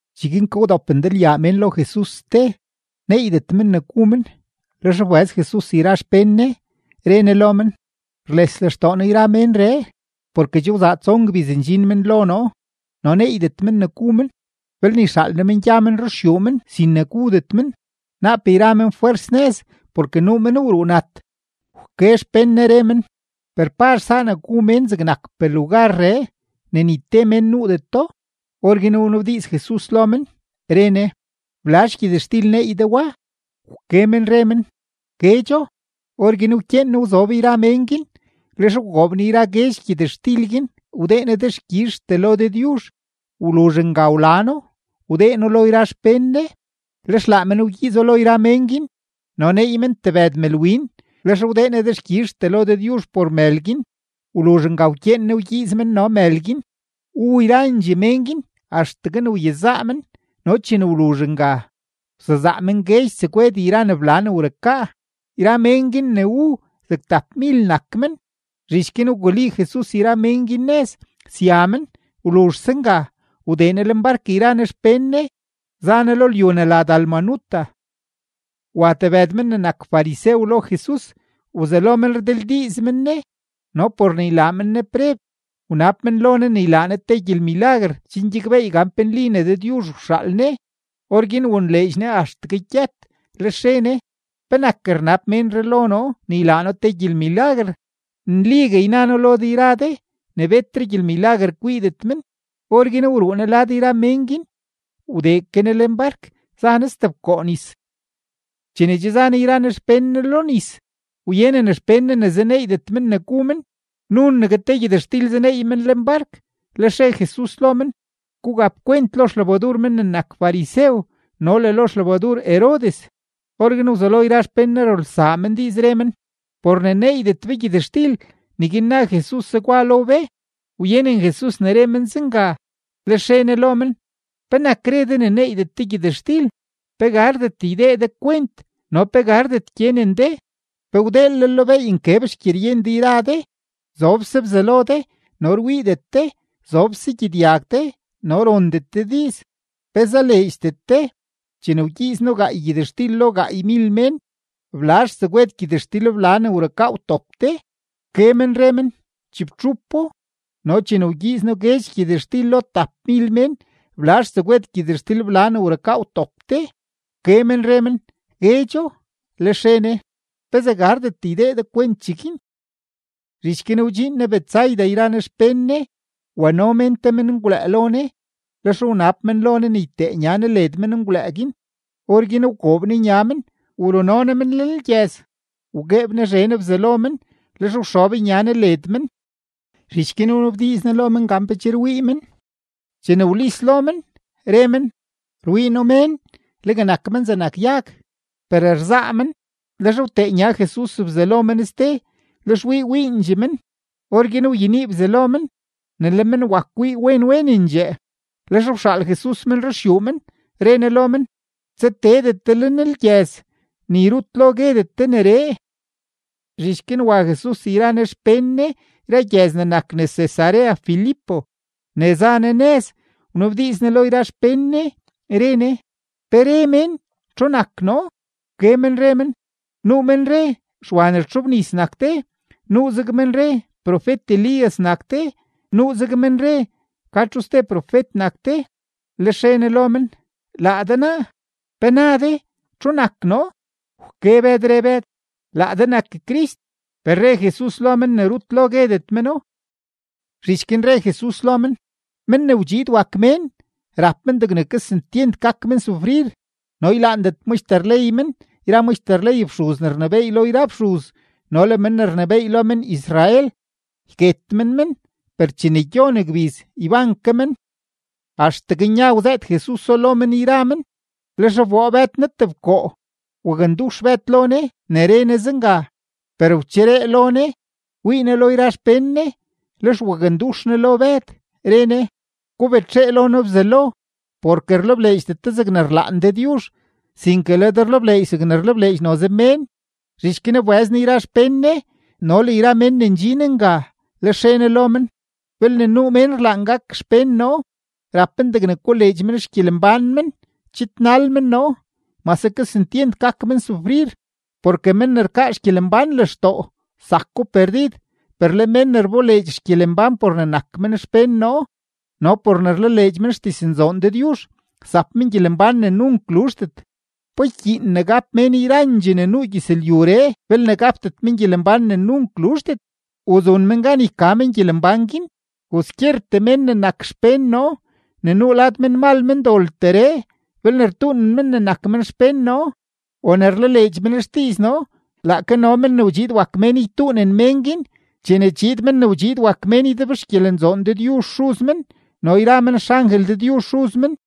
Cheguin ke wdop ndalyaa mén lo Jesus ste, neeydet men ne gu men. Lex wbëz Jesus yra xpén Ne, re Ne lo men: ―Rles lextoo noo yra ménree, porke che wzaa tson gbiz ndxin men lo noo no neeydet men ne gu men. Belne yxaal noo men gya men ruxyuu men sin ne gudet men, naap yra men fwers nëz porke nuu men wruu nat. Wke xpén Ne, re men: ―Per ¿pazh saa ne gu men zegnakpee lugarree ne ni te mén nuudeto? Orguin wnabdiiz Jesus lo men, re Ne: ―¿Blazh gyëtxtil neey de wa? Wke men re men: ―Guedxo. Orguin wkyeen Ne wzob yra mén guin. Lex wgoob Ne yra guedx gyëtxtil guin, wdee Ne dexkyizhtee lo Dëdyuzh. Wluzh nga wla No, wdee No lo yra xpén Ne, lex laa men wgyiizo lo yra mén guin. No neey men tebëd mëlwin. Lex wdee Ne dexkyizhtee lo Dëdyuzh por mël guin; wluzh nga wkyeen Ne wgyiiz men no mël guin. Wu yrandxee mén guin axtegue ne wyezaa men, no chene wluzh nga, wsezaa men guedx tsegwed yra ne bla ne wrukaa. Yra mén guin ne wu, zeg tapmil nak men. Zhich guin wguli Jesus yra mén guin nëz, sya men. Wluzhse nga, wdee Ne lenbark yra Ne xpén Ne, za Ne lo lyu ne la Dalmanuta. Wa tebëd men ne nak farisew lo Jesus, wzelo men rdildiiz men Ne, no por ne ylaa men Ne preb, wnab men lo Ne ne ylaa Ne te gyelmilaguer chen gyakbeey gan pe nli ne Dëdyuzh wxaal Ne. Orguin wonleedx Ne axtegue gyët, lex re Ne: ―¿Penak rnab ménree lo noo ne ylaa noo te gyelmilaguer? Nligue yna noo lo de yra de ne betre gyelmilaguer kwiidet men. Orguin wruu Ne lad yra mén guin, wdee ke Ne lenbark, za Ne stebkoo nis. Chene che za Jesus yra Ne xpén Ne lo nis, wyenen xpén Ne ne zaneeydet men ne gu men; nunegue te gyëtxtil zaneey men lenbark. Lex re Jesus lo men: ―Gugap kwent lo xlebadur men ne nak farisew no le lo xlebadur Herodes. Orguin wzelo yra xpén Ne rulsaa men diiz, re men: ―Por ne neeydet be gyëtxtil, neguin na Jesus zegwa lo be. Wyenen Jesus ne re men zenga, lex re Ne lo men: ―¿Penak re de ne neeydet de gyëtxtil? ¿Pe gardet ydee de kwent no pe gardet gyenen de? ¿Pe wdeelel lo beey nkeb xgyeryen de yra de? Zobse bzalo de no rwiidet de; zobse gyedyag de no rondet de diiz. ¿Pe zaleedxdet de? Chene wgyiiz noo gaay gyëtxtil lo gaaymil mén, ¿blazh tsegwed gyëtxtilbla ne wrukaa wtop de? Wke men re men: ―Chibtxupo. ―No chene wgyiiz noo guedx gyëtxtil lo tapmil mén, ¿blazh tsegwed gyëtxtilbla ne wrukaa wtop de? Wke men re men: ―Guedxo. Lex re Ne: ―¿Pezee gardet ydee de kwent cheguin? Zhich guin wdxiin Jesus Betsaida yra Ne xpén Ne. Wano mén te menngwlëë lo Ne, lex wnab men lo Ne ne ytee nya Ne led menngwlëë guin. Orguin wgoob Ne nya men, wruno Ne men lenlgyëz. Wgueeb Ne zhen bzalo men, lex wxob nya Ne led men; zhich guin wnabdiiz Ne lo men gan pe che rwii men. Chene wlis lo men, re men: ―Rwii noo mén, legue nak men zegnak yag, per rzaa men. Lex wtee nya Jesus bzalo men ste, lex wii wiindxee men; orguin wyenii bzalo men, ne le men wak wii wen wenendxee. Lex wxaal Jesus men ruxyuu men, re Ne lo men: ―Tsateedet de lenlgyëz, ni rut lo guedet de neree. Zhich guin wa Jesus yra Ne xpén Ne yra gyëz ne nak nes Cesarea Filipo. Ne za Ne nëz, wnabdiiz Ne lo yra xpén Ne, re Ne: ―¿Pe re mén txu nak noo? Wke men re men: ―Nuu men re Xwa ne rtxobnis nak de, nuuzeg men re profet-Elías nak de, nuuzeg men re ka txu ste profet nak de. Lex re Ne lo men: ―Laa de naa, ¿pe na de txu nak noo? Wke Bëd, re Bëd: ―Laa de nak Crist. Per re Jesus lo men ne rut lo guedet meno. Zhich guin re Jesus lo men: ―Men ne wdxiid wak Mén, rap men degne kesentyent gak men sufrir, no ylaandet maxter ley men yra maxter ley fxuz ne rnebééy lo yra fxuz no le men ne rnebééy lo men-Israel. Yket men men, per chene gyon gbiz, yban ke men. Axtegue nya wzëët Jesuso lo men yra men. Lex wboo Bëd Ne tebkoo, wakndux Bëd lo Ne ne re Ne zenga. Per wcheree lo Ne, wii Ne lo yra xpén Ne, lex wakndux Ne lo Bëd, re Ne: ―¡Gubetxee lo noo Bzelo! Porke rlebleedxdet de zegne rlaan Dëdyuzh, sinke le de rlebleedx zegne rlebleedx noze mén. Zhich guin wbëz Ne yra xpén Ne no le yra mén ne ndxin nga, lex re Ne lo men: ―Belne nuu mén rlaan gak xpén noo, rap men degne koleedx men xgyelembán men, chidnal men noo, mase kesentyent gak men sufrir. Porke men ne rkaa xgyelembán lextoo, zako perdid; per le men ne rboleedx xgyelembán por ne nak men xpén noo no por ne rlaleedx men xdiznzoon Dëdyuzh, zap men gyelembán ne nunk luzhdet. ¿Pa ykyiin ne gap mén yrandxee ne nuu gyëzlyuree belne gapdet men gyelembán ne nunk luzhdet? ¿U zun men gan yka men gyelembán guin? Kwaskyertee mén ne nak xpén noo ne nuu lad menmal mendolteree, belne rtuunen men ne nak men xpén noo o ne rlaleedx men xdiiz noo, laake no Men ne wdxiid wak Mén ytuunen mén guin chene chiid Men ne wdxiid wak Mén ydebxgyelenzoon Dëdyuzh Xuz men no yra men xangel Dëdyuzh Xuz men.